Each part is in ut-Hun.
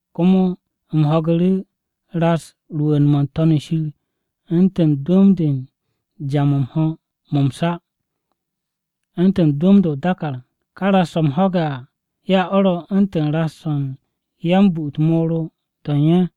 Komo u̱m ho̱gu̱ru̱ ras rwu̱u̱n-mo̱ n-To̱n shir u̱ntu̱n dwu̱m-de u̱n ja-mo̱ m-ho̱ mo̱ m-sa, u̱ntu̱n dwu̱m-de o-dàkàr. Ka ras-o̱ u̱m ho̱ge̱ à ya o̱ ro u̱ntu̱n ras-o̱ u̱n yan-bu u̱t-moro to̱ u̱n ye̱.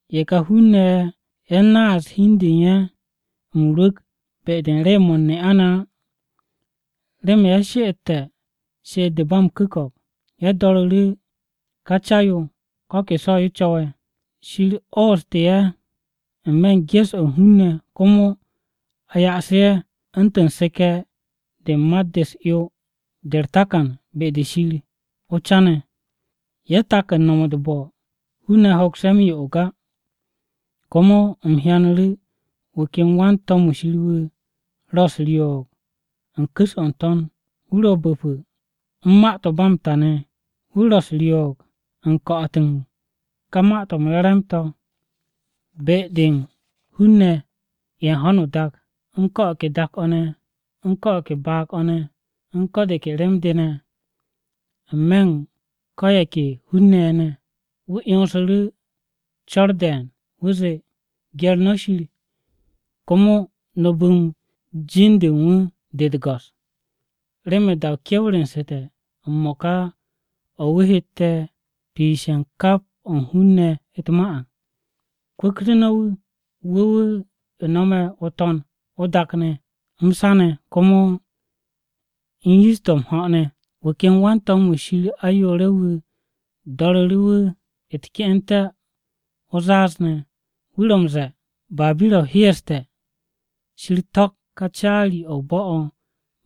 Ye̱ ka hun-ne̱ ye̱, ye̱ naase̱ hi u̱n de u̱n ye̱ m-rwu̱k be-de u̱n rew-mo̱ u̱n ne'a-ne̱ á, remen ye̱ she'etté̱ she'et-de ba m-ku̱ko̱p. Ye̱ do̱ru̱ru̱ ká Ca-yo ko̱ ke so̱-yo co̱we̱. Shir ooste̱ ye̱ n-me̱ u̱n ges-o̱ u̱n hun-ne̱ komo a ya'asu̱ ye̱ u̱ntu̱n seke̱-de u̱n mat-de u̱s-'yo de u̱r-takan be-de Shir o-Ca ne̱. Ye̱ tak u̱n no̱m u̱t-bo̱, hun-ne̱ hoks ye̱ m-yo'og á. Komo u̱m hyanu̱ru̱ wu̱ ken wan-to̱m-wu̱ Shir wu̱ ro̱ u̱s-ryoog u̱n ku̱s-o̱ n-to̱n. Wu̱ ro̱ bu̱pu̱ u̱n ma-to̱ ba m-ta ne̱, wu̱ u̱s-ryoog u̱n ko̱'o̱t u̱n ka Ma-to̱ m-Re̱re̱m ne̱ be-de u̱n hun-ne̱ ye̱ u̱n ho̱no o-dak, u̱n ko̱ o̱ ke dak-o̱, u̱n ko̱ o̱ ke baag-o̱, u̱n ko̱ de ke rem-de ne̱, n-me̱ u̱n ko̱ ye̱ ke hun-ne̱ ye̱. Wu̱ 'yonsu̱ru̱ co̱r de̱e̱n, wu̱ zee, “Gye̱r no̱ Shir, komo no̱ bu̱m jin-de u̱n wu̱ de u̱t-go̱s. Remen da-o kewru̱nsu̱te̱ m-mo̱ka o̱ wu̱ hette̱ piishe̱ u̱n kap o̱ u̱n hun-ne̱ u̱t-ma à. Kwu̱ktu̱ no̱ wu̱, wu̱ wu̱ no̱me̱ o-To̱n, o-dak ne̱, m-sa ne̱, komo u̱n yish-to̱ m-ho̱ ne̱!” Wu̱ ken wan-to̱m-wu̱ Shir ayoore̱-wu̱ do̱ru̱ru̱ wu̱ u̱t-ke'ente̱ o-zaaz, wu̱ ro̱ m-ze̱e̱, “Babira-o hyeeste̱, Shir to̱k ká caari-o̱ o-bo̱ o̱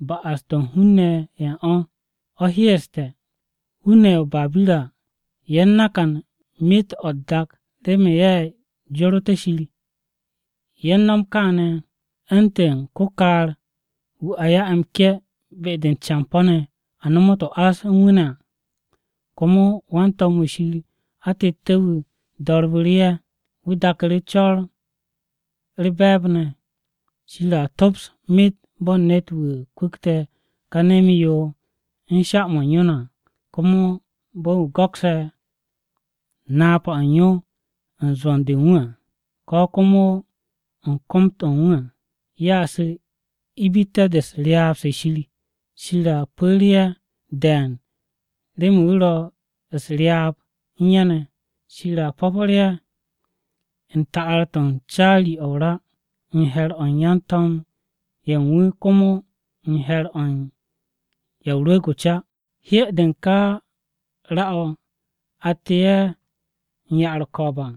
ba'as-to̱ u̱n hun-ne̱ ye̱ u̱n o̱, o̱ hyeeste̱! Hun-ne̱ o-Babira ye̱ nakante̱ myet o̱ u̱t-dak remen ye̱ joroté̱ Shir. Ye̱ m-no̱m kááne̱ u̱ntu̱n ko-kaar-wu̱ a ya'e̱ m-ke̱ be-de u̱n campo̱-ne̱ a nomot o-ás u̱n wu̱ ne̱ à.” Komo wan-to̱m-wu̱ Shir atette̱-wu̱ do̱rbu̱ru̱ ye̱, wu̱ daku̱ru̱ co̱r-o̱ u̱r-be̱e̱b ne̱, “Shir a tops myet bo̱n ne̱t-wu̱ kwu̱kte̱ ka nem-yo u̱n sha-mo̱ u̱n yo ne̱ à. Komo bo̱n wu̱ go̱kse̱ napa-o̱ u̱n yo u̱n zwo̱n-de u̱n wu̱ à, ko̱ komo u̱n kom-to̱ u̱n wu̱ à, Ye̱a su̱ ibitte̱-de u̱n ryaab-se Shir, Shir a pu̱re̱ ye̱ de̱e̱n remen wu̱ ro̱ u̱s-ryaab u̱n ye̱ ne̱. Shir a po̱po̱r ye̱ u̱n ta'ar-to̱ u̱n caari-o̱ o-ra n-he̱r o̱ u̱n yan-to̱m ye̱ u̱n wu̱ komo n-he̱r o̱ u̱n Ya o-Rwu̱u̱g o-Ca. Hye-de u̱n ka ra-o̱ atte̱ ye̱ u̱n ya-u̱r-ko̱o̱b à,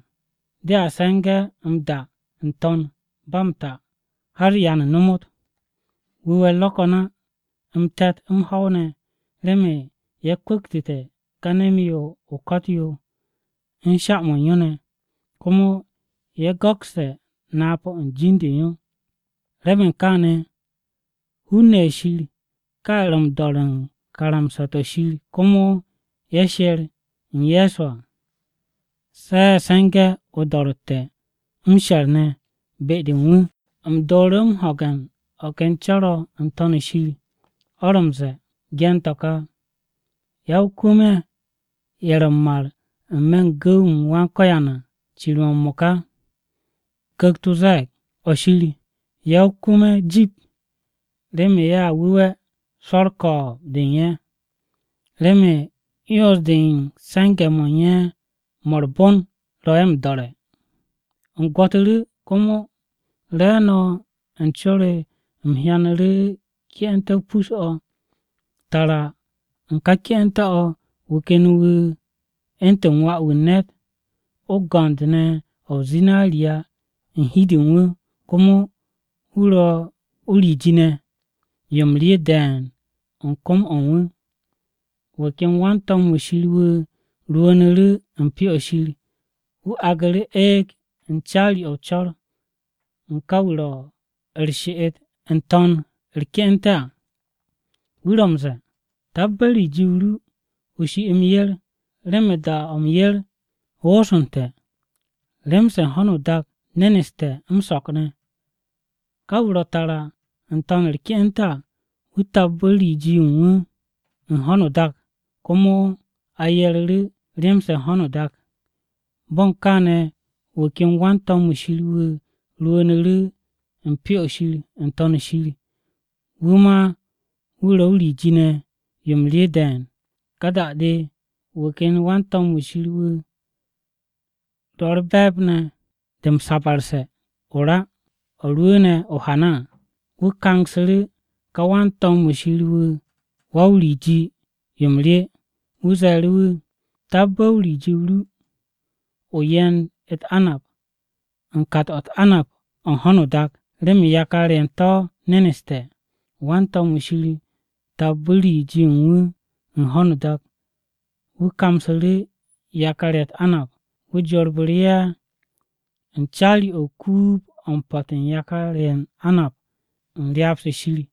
de se̱ngu̱ m-da n-to̱n ba m-ta har ya nomot. Wu̱we̱-u̱r ro̱ ko̱n á m-te̱t, m-ho̱w ne̱, remen ye̱ kwu̱ktu̱te̱ ka nem-yo o-ko̱t yo u̱n sha-mo̱ u̱n yo ne̱, komo ye̱ go̱kste̱ napa-o̱ u̱n jin-de u̱n yo.” Remen kaane̱, hun-ne̱ ye̱ Shir, ká ye̱ ro̱ m-do̱re̱ u̱n karamsa-to̱ Shir komo ye̱ sher u̱n Ye̱so à, se̱ ye̱ se̱nge̱ o-do̱ro̱tte̱ m-she̱r ne̱ be-de u̱n wu̱. U̱m dooru̱ ho̱ge̱ u̱n o̱ ken co̱r-o̱ n-To̱n shir o̱ ro̱ m-ze̱e̱, “Ge̱n to̱ ka: Ya-o-kwu̱m-ye̱, ye̱ ro̱ m-mar n-me̱ u̱n gu̱w-m Wan-Ko̱yan à cir-mo̱ m-mo̱ka!” Ku̱kt-o ze̱e̱g, “Nip-o̱! Ya-o-kwu̱m-ye̱ jip remen ye̱a wu̱we̱ swo̱ u̱r-ko̱o̱b de u̱n ye̱, remen 'yons-de u̱n se̱nge̱-mo̱ u̱n ye̱ mo̱ u̱r-bon ro̱ ye̱ m-do̱re̱!” U̱m gwo̱tu̱ru̱, komo re̱e̱no̱ u̱n co-o re u̱m hyanu̱ru̱ ke'ente̱-o pus-o̱, tara u̱n ka ke'ente̱-o̱ wu̱ ken wu̱ “u̱ntu̱n Wà-wu̱ u̱n Ne̱t” o-go̱nd ne̱ o̱ o-zinariya u̱n hi-de u̱n wu̱, komo wu̱ ro̱ o-riji ne̱ yo m-rye de̱e̱n u̱n kom-o̱ u̱n wu̱. Wu̱ ken wan-to̱m-wu̱ Shir wu̱ rwu̱u̱nu̱ru̱ u̱n Pyo-o̱ Shir wu̱ aagu̱ru̱ eeg u̱n caari-o̱ o-co̱r u̱n ka wu̱ ro̱ u̱r-she'et n-to̱n u̱r-ke'ente̱ à. Wu̱ ro̱ m-ze̱e̱ “Tabbe̱ riji-o ru, o shi m-yer, remen da-o̱ m-yer wooste̱. Rem-se u̱n ho̱no o-dak neneste̱ m-so̱k ne̱.” Ka wu̱ ro tara n-to̱n u̱r-ke'ente̱ à, wu̱ tabbu̱ riji-yo u̱n wu̱ u̱n ho̱no o-dak komo a yeru̱ru̱ rem-se u̱n ho̱no o-dak. Bo̱ u̱n kaane̱ wu̱ ken wan-to̱m-wu̱ Shir wu̱ rwu̱u̱nu̱ru̱ u̱n Pyo-o̱ Shir n-To̱n shir, wu̱ ma wu̱ ro o-riji ne̱ yo m-rye de̱e̱n. Ka da-de wu̱ ken wan-to̱m-wu̱ Shir, wu̱ ro̱ u̱r-be̱e̱b de m-sabarse̱ ne̱ o-ra, o̱ rwu̱u̱ne̱ o-hana à. Wu̱ kangsu̱ru̱ ká wan-to̱m-wu̱ Shir wu̱ wa-o-riji yo m-rye. Wu̱ ze̱e̱ru̱ wu̱, “Tabbe̱ riji-o ru, o ye̱nd u̱t-anab u̱n kat-o̱ u̱t-anab o̱ u̱n ho̱no o-dak, remen yakar-ye̱ u̱n to̱ neneste̱.” Wan-to̱m-wu̱ Shir tabbu̱ riji-yo u̱n wu̱ u̱n ho̱no o-dak, wu̱ kamsu̱ru̱ yakar-ye̱ u̱t-anab. Wu̱ jorbu̱ru̱ ye̱ u̱n caari-o̱ o-kuub o̱ u̱n po̱t u̱n yakar-ye̱ u̱n anab u̱n ryaab-se Shir.